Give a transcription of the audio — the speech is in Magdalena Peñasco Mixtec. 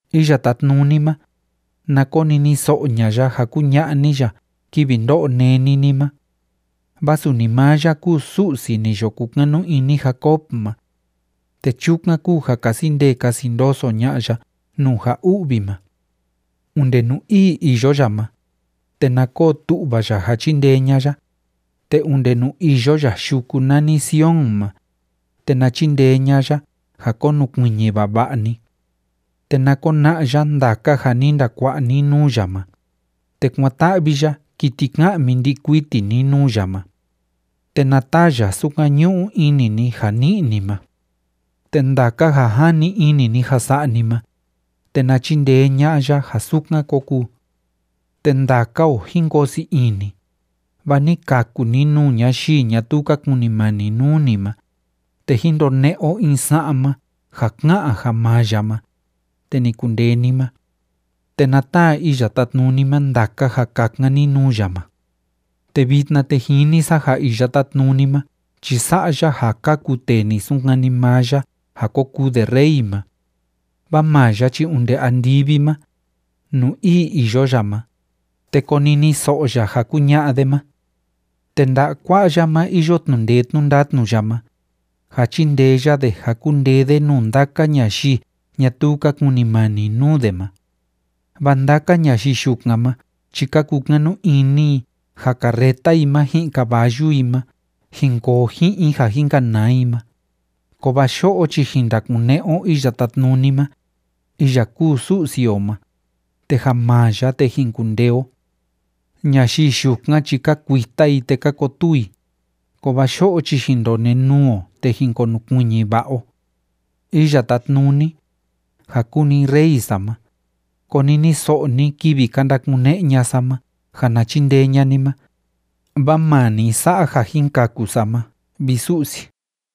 Iya Tátnuni ma, na koniniso'o ña'a ya ja kuña'a ni ya kivi ndó'o néni ni ma. Vaa suni maa ya kúu Su'si ni yo kukanu ini Jacob ma, te chukan kúu ja kasi ndee kasi ndoso ña'a ya nuu ja u'vi ma. Onde nuu ii iyo ya ma, te na koo tu'va ya ja chindee ña'a ya, te onde nuu iyo ya yuku nani Sion ma, te na chindee ña'a ya ja konukuiñi vava'a ni. Te na kona'a ya ndaka ja ni ndakua'a ni nuu ya ma, te kuán‑ta'vi ya kiti ka'mi ndi'i kuiti ni nuu ya ma. Te na taa ya sukan ñu'u ini ni ja ni'i ni ma. Te ndaka ja jani ini ni ja sa'a ni ma, te na chindee ña'a ya ja sukan kó kuu. Te ndaka o jín koo sii ini, vaa ni kaku ni nuu ñayii ñatuu ka kunimani nuu ni ma, te jín ndone'e o in sa'ma ja ká'an ja maa ya ma, te ni kundee ni ma. Te na taa Iya Tátnuni ma ndaka ja kakan ni nuu ya ma. Te vitna, te jini sa ja Iya Tátnuni ma chi sa'a ya ja kaku tee ni sunkani maa ya ja ko kuu de rey ma. Vaa maa ya chi onde andivi ma, nuu ii iyo ya ma, te koniniso'o ya ja kuña'a de ma. Te nda'a kua'a ya ma iyo tnu'u ndee tnu'u ndatnu ya ma, ja chindee ya de ja kundee de nuu ndaka ñayii ñatuu ka kunimani nuu de ma. Vaa ndaka ñayii yukan ma chi ka kukanu ini i ja carreta i ma ji'in caballu i ma jin koo ji'in i ja jin kanaa i ma, kovaa yo'o chi jin ndakune'e o Iya Tátnuni ma, iya kúu Su'si o ma, te ja maa ya, te jin kundee o. Ñayii yukan chi ka kuita i te ka kotuu i, kovaa yo'o chi jin ndonenuu o te jin konukuiñi va'a o. Iya Tátnuni, ja kúu ni Rey sa ma, koniniso'o ni kivi ka ndakune'e ña'a sa ma ja na chindee ña'a ni ma, vaa maa ni sa'a ja jin kaku sa ma, vi Su'si.